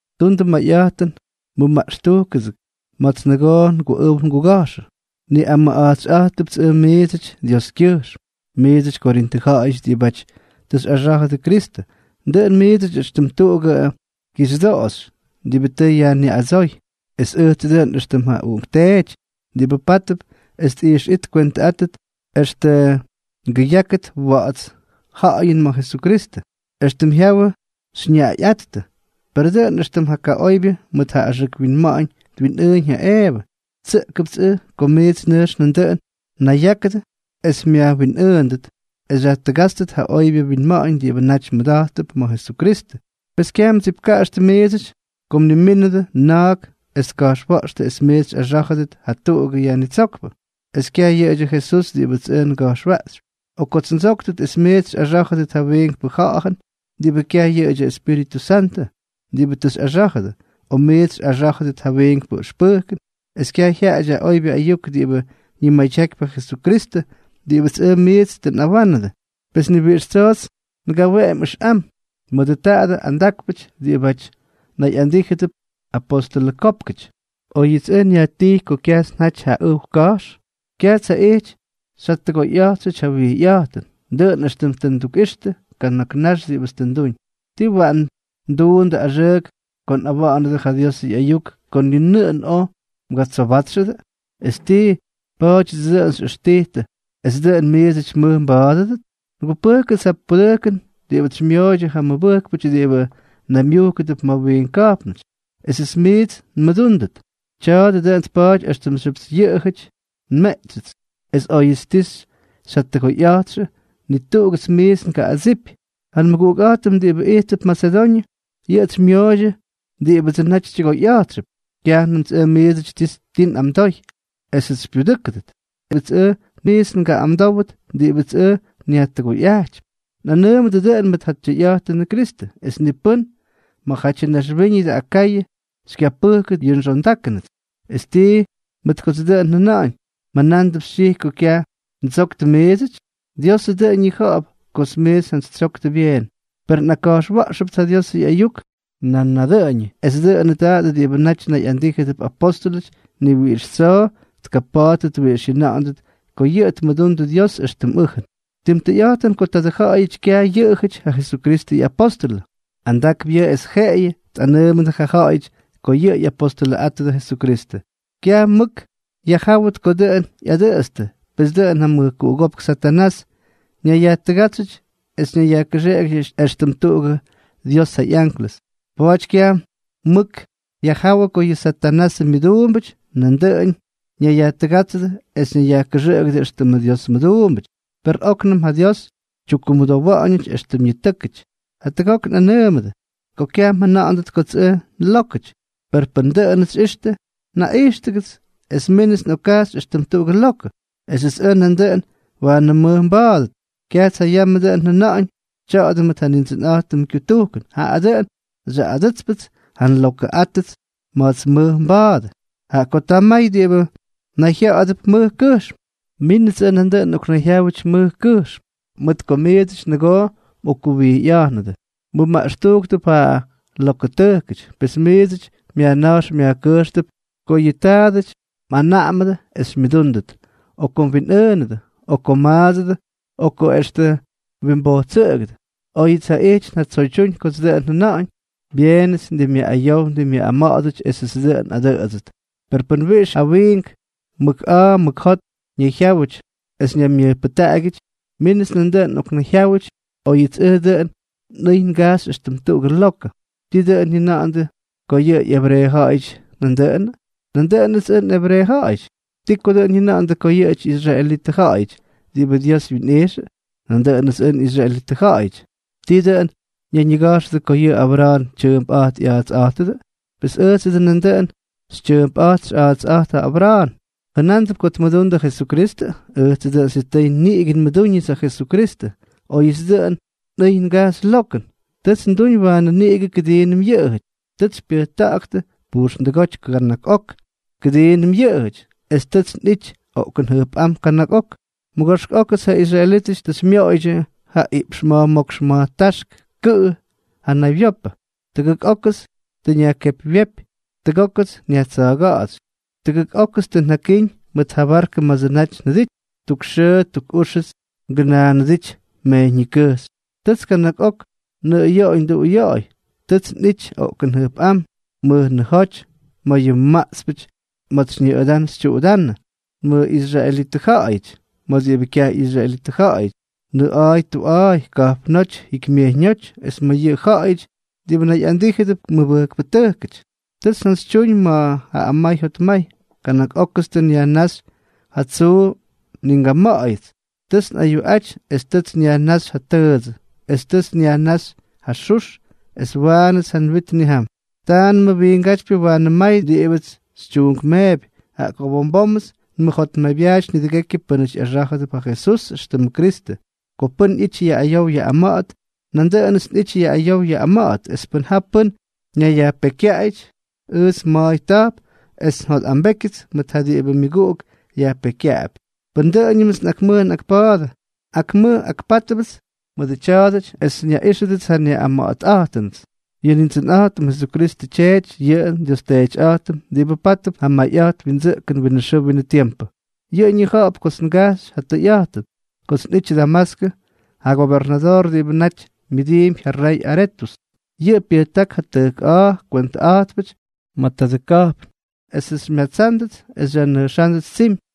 Tundʉ mayꞌa̱jtʉn, mʉmaꞌxtujktʉgʉts ma̱ts nʉgoo nguꞌʉw nguga̱jxʉ. Nꞌamʉꞌa̱jtsyꞌa̱jttʉpts ʉj miidsʉty Dioskyʉjxm. Miidsʉty, Korintʉ ja̱ꞌa̱yʉty diꞌibáty tʉ xyꞌaxá̱jʉdʉ Kristʉ, dʉꞌʉn miidsʉty éxtʉm tuꞌugʉ kixyʉdoꞌoxy diꞌibʉ tʉ yajniꞌadsóy, es ʉjtsʉ dʉꞌʉn éxtʉm ja uꞌunkteety diꞌibʉ pátʉp es nꞌijxꞌít ngwentʉꞌáttʉt extʉ ngʉyákʉt wa̱ꞌa̱ts ja̱ꞌa̱yʉn ma̱ Jesukristʉ, éxtʉm jyawʉ xyñaꞌayꞌáttʉ. Per dʉꞌʉn éxtʉm ja kaꞌoybyʉ mʉt ja axʉk winma̱ꞌa̱ñ twinꞌʉꞌʉñ ja Eevʉ, tsʉꞌkʉpts ʉj ko miits nʉjx nandʉꞌʉn mnayyákʉdʉ es myajwinꞌʉʉndʉt es xyajtʉgátstʉt ja oybyʉ mwinma̱ꞌa̱ñ diꞌibʉ naty mmʉda̱jttʉp ma̱ Jesukristʉ. Pes kyaj mdsipkaꞌaxtʉ miidsʉty ko mnimínʉdʉ na̱a̱k es tka̱jxwa̱ꞌxtʉ es miits xꞌaxá̱jʉdʉt jatuꞌugʉ yajnitsókpʉ, es kyaj yʉꞌʉdyʉ Jesús diꞌibʉts ʉj nga̱jxwaꞌxypy; o ko ttsóktʉt es miits xyꞌaxá̱jʉdʉt ja wiinkpʉ ja̱ꞌa̱jʉn diꞌibʉ kyaj yʉꞌʉdyʉ Espíritʉ Santʉ diꞌibʉ tʉ xyꞌaxá̱jʉdʉ; o miits xyꞌaxá̱jʉdʉt ja wiinkpʉ ʉxpʉjkʉn, es kyaj jyaꞌadyʉ oybyʉ ayuk diꞌibʉ ñimadyakypy ja Jesukristʉ diꞌibʉts ʉj miits tʉ nꞌawánʉdʉ. Pes ni wiꞌix tsoots ngaweꞌemy ʉxꞌam mʉdʉ tadʉ andákpʉty diꞌibáty nayꞌandíjʉdʉp apostʉlʉkópkʉty. Oyʉts ʉj nyajtijy ko kyajts njaty ja ʉw ka̱jx, kyajts jaꞌijty xyjatʉgoyꞌa̱jtxʉty ja wijyꞌa̱jtʉn, dʉꞌʉn éxtʉm tʉ ndukꞌixtʉ kana̱k nax diꞌibʉts tʉ nduñ. ¿Tii waꞌan nduundʉ axʉʉk ko nꞌawa̱ꞌa̱nʉdʉ ja Diosʉ ꞌyayuk ko ni nʉꞌʉn oj mgatsobátxʉdʉ? ¿Es tii, pa̱a̱dyʉdsʉ dʉꞌʉn xyꞌʉxtijtʉ es dʉꞌʉn miidsʉty mʉj mba̱a̱dʉdʉt? Ngupʉjkʉts ja pudʉjkʉn diꞌibʉts xymyooydyʉ ja mʉbʉjkpʉty diꞌibʉ naymyujkʉdʉp ma̱ wiink ka̱jpnʉty, esʉts miits nmʉdúndʉt. Tya̱a̱dʉ dʉꞌʉn tpaty éxtʉmxyʉpts yʉꞌʉjʉty nmeꞌtsyʉts. Es óyʉts oj ti xytyʉgoyꞌa̱jtxʉ, ni tuꞌugʉts miits ngaꞌꞌadsijpy. Ja nmʉguꞌukꞌa̱jtʉm diꞌibʉ ijttʉp Masedoñʉ, yʉꞌʉts xymyooydyʉ diꞌibʉdsʉ naty xytyʉgoyꞌa̱jtxʉp. Kyajnʉmts ʉj miidsʉty ti nꞌamdoy esʉts xypyudʉ́kʉdʉt, es ni na̱ꞌa̱ts miits ngaꞌꞌamdówdʉt diꞌibʉts ʉj nyajtʉgoyꞌajtypy. Nꞌanʉʉmʉdʉ dʉꞌʉn mʉt ja tyʉyꞌa̱jtʉnʉ Kristʉ, es ni pʉ́n ma̱jatyʉ ñaxwíñʉdʉ Akayʉ xykyapʉjkʉt yʉ nxondákʉnʉts. ¿Es tii, mʉt kots dʉꞌʉn njʉna̱ꞌa̱ñ, mjʉnándʉp xytyijy ko kyaj ndsoktʉ miidsʉty? ¡Diosʉ dʉꞌʉn ñija̱ꞌa̱p kots miits njantsytsyoktʉ byeen! Per nꞌakka̱jxwa̱ꞌxʉpts ja Diosʉ ꞌyayuk nan nadʉꞌʉñʉ, es dʉꞌʉnʉ tadʉ diꞌibʉ nayꞌandíjʉdʉp apóstʉlʉty ni wiꞌix tsoo tkapa̱a̱ttʉt wiꞌix jyʉna̱ꞌa̱ndʉt ko yʉꞌʉ tmʉdundʉ Dios éxtʉm ʉjʉn. Tim tʉyꞌa̱jtʉn ko tadʉ ja̱ꞌa̱yʉty kyaj yʉꞌʉjʉty ja Jesukristʉ ꞌyapóstʉlʉ. Andakp yʉꞌʉ es jeꞌeyʉ tꞌanʉʉmʉdʉ ja ja̱ꞌa̱yʉty ko yʉꞌʉ ꞌyapostʉlʉꞌátʉdʉ Jesukristʉ. Kyaj mʉk yajjáwʉt ko dʉꞌʉn ꞌyadʉꞌʉtstʉ, pes kʉꞌʉm ja mʉjkuꞌugópk Satanás ñayyajtʉgátsyʉty es ñayyajkʉxeꞌegyʉty éxtʉm tuꞌugʉ Dios ja ꞌyanklʉs. Pa̱a̱ty kyaj mʉk yajjáwʉ ko yʉ Satanasʉ myʉduumbʉty nandʉꞌʉn ñayyajtʉgátsʉdʉ es ñayyajkʉxʉꞌʉgʉdʉ éxtʉmʉ Dios mʉduumbʉty. Per óknʉm ja Dios tyukkumʉdowa̱ꞌa̱ñʉty éxtʉm ñitʉ́kʉty. Jatʉgok nꞌakꞌanʉʉmʉdʉ ko kyaj mjʉna̱ꞌa̱ndʉt kots ʉj nlókʉty; per pʉn dʉꞌʉnʉts xyꞌixtʉ, naꞌijxtʉgʉts es mínʉts nꞌokkajxy éxtʉm tuꞌugʉ lokʉ, esʉts ʉj nandʉꞌʉn waanʉ nmʉj nba̱a̱dʉt. Kyajts ja yamʉ dʉꞌʉn njʉna̱ꞌa̱ñʉ tya̱a̱dʉ mʉt ja Nindsʉnꞌa̱jtʉmʉ kyutujkʉn, jaꞌa dʉꞌʉn xyaꞌꞌadʉ́tspʉts ja nlokʉꞌátʉts ma̱ts nmʉj nba̱a̱dʉ. Jaꞌa ko ta may diꞌibʉ nayjya̱ꞌa̱dʉp mʉj kʉjxm, mínʉts ʉj nandʉꞌʉn nꞌoknayjyáwʉty mʉj kʉjxm. Mʉt ko miidsʉty nʉgoo mꞌokkuwijyatyꞌa̱jnʉdʉ, mmʉmaꞌxtujktʉp ja lokʉtʉjkʉty. Pes miidsʉty myajna̱jx myajkʉjxtʉp ko yʉ taadʉty mꞌanaꞌamʉdʉ es xymyʉdúndʉt, o ko mwinꞌʉʉnʉdʉ, o ko mmaadsʉdʉ o extʉ ko mwimbojtsʉꞌʉgʉdʉ. Oyʉts jaꞌijty njatsoydyúñ kots dʉꞌʉn njʉna̱ꞌa̱ñ, ¡byeenʉts ʉj ndimꞌyaꞌꞌayow ndimꞌyaꞌꞌama̱ꞌa̱dʉty esʉts dʉꞌʉn nꞌadʉꞌʉdsʉt! Per pʉn wiꞌix ja wiink mʉk a̱a̱ mʉk jot ñayjyáwʉty es ñaymyʉjpʉjtaꞌagyʉty, mínʉts ʉj nandʉꞌʉn nꞌoknayjyáwʉty, óyʉts ʉj dʉꞌʉn nꞌʉy ngajxy éxtʉm tuꞌugʉ lokʉ. ¿Tii dʉꞌʉn jyʉna̱ꞌa̱ndʉ ko ꞌyebreeʉja̱ꞌa̱yʉty yʉꞌʉdyʉ? Nandʉꞌʉnʉts ʉj nꞌebreeʉja̱ꞌa̱yʉty. ¿Tii dʉꞌʉn jyʉna̱ꞌa̱ndʉ ko yʉꞌʉjʉty ꞌyisraelitʉja̱ꞌa̱yʉdyʉ diꞌibʉ Dios wyinꞌijxʉ? Nandʉꞌʉnʉts ʉj nꞌisraelitʉja̱ꞌa̱yʉty. ¿Tii dʉꞌʉn ñayñiga̱jxʉdʉ ko yʉꞌʉ Abra̱a̱n tyʉʉmpꞌát ꞌya̱a̱tsꞌátʉdʉ? Pes ʉjtsʉ dʉꞌʉn nandʉꞌʉn xytyʉʉmpꞌa̱jt xyꞌa̱a̱tsꞌa̱jtp ja Abra̱a̱n. ¿Jʉnándʉp ko tmʉdundʉ ja Jesukristʉ? Ʉjtsʉ dʉꞌʉn sitʉy niꞌigʉ nmʉdúñʉts ja Jesukristʉ. Oyʉts dʉꞌʉn nꞌʉy ngajxy lokʉn, tʉts nduñ waanʉ niꞌigʉ kʉdiinʉm yʉꞌʉjʉty. Tʉts xypyʉjta̱ꞌa̱ktʉ pujxndʉgóty kana̱k ok kʉdiinʉm yʉꞌʉjʉty, es tʉts nꞌity oꞌkʉn jʉjpꞌám kana̱k ok. Mʉgoxk ókʉts ja israelítʉty tʉ xymyoꞌoydyʉ ja iꞌpx ma̱jmókx ma̱jtáxk kʉꞌʉ ja naywyopʉ. Tʉgʉk ókʉts tʉ nyajkepywyépy, tʉgókʉts nyajtsa̱ga̱ꞌtsy, tʉgʉk ókʉts tʉ njakíñ mʉt ja barkʉ ma̱dsʉ naty njʉdity, tuk xʉʉ tuk úxʉts ngʉnaanʉdijty mejyññikʉjxy. Tʉts kana̱k ok nnʉꞌʉyoꞌoy nduꞌuyoꞌoy. Tʉts nꞌity oꞌkʉn jʉjpꞌám, mʉjnʉjóty, ma̱ yʉ maꞌtspʉty, ma̱ts xyñʉꞌʉdán xytyuꞌudánʉdʉ, ma̱ nmʉꞌisraelitʉ ja̱ꞌa̱yʉty, ma̱ diꞌibʉ kyaj ꞌyisraelítʉty, nʉꞌa̱a̱y tuꞌa̱a̱y, ka̱jpnóty, jikymyejyñóty, es ma̱ yʉ ja̱ꞌa̱yʉty diꞌibʉ nayꞌandíjʉdʉp mʉbʉjkpʉtʉjkʉty. Tʉts njantsytyúñ mʉt ja amay jotmay. Kana̱k ókʉts tʉ nyajnáxy ja tsuu ni ngama̱ꞌa̱yʉts. Tʉts nꞌayuꞌaty es tʉts nyajnáxy ja tʉʉdsʉ, es tʉts nyajnáxy ja xux, es waanʉts ja nwit nnijam. Taanʉmʉ wiingátypyʉ waanʉ may diꞌibʉts xytyuunkmeepy, jaꞌa ko bom bómʉts nmʉjotmaybyaaty nidʉgekyʉ pʉ́nʉty ꞌyaxá̱jʉdʉp ja Jesús éxtʉmʉ Kristʉ. Ko pʉ́n ꞌyity yaꞌꞌayow yaꞌꞌama̱ꞌa̱t, nandʉꞌʉnʉts nꞌity yaꞌꞌayow yaꞌꞌama̱ꞌa̱t; es pʉn ja pʉ́n ñayyajpekykyaꞌayʉty, ʉjts ma̱a̱y ta̱jp es njotꞌambékyʉts mʉt ja diꞌibʉ myʉguꞌuk yajpekykyaꞌapy. Pʉn dʉꞌʉñʉmts nꞌakmʉj nꞌakpa̱a̱dʉ, akmʉj akpa̱a̱dʉpts mʉdʉ tya̱a̱dʉty es nyaꞌíxʉdʉts ja nyaꞌꞌama̱ꞌa̱tꞌa̱jtʉnʉts. Yʉ Nindsʉnꞌa̱jtʉm Jesukristʉ Tyeety, yʉ nDios Teetyꞌa̱jtʉm diꞌibʉ pátʉp ja mayꞌa̱jt windsʉꞌkʉn winʉ xʉʉ winʉ tiempʉ, yʉꞌʉ ñija̱ꞌa̱p kots ngajxy ja tʉyꞌa̱jtʉn. Kots nꞌijty Damaskʉ, ja gobernadoor diꞌibʉ naty myʉdiimpy ja rey Aretʉs, yʉꞌʉ pyʉjták ja tʉjk a̱a̱ kwentʉꞌa̱jtpʉty ma̱ tadʉ ka̱jpn, esʉts xymyatsándʉts es xyajnʉjxándʉts tsimy;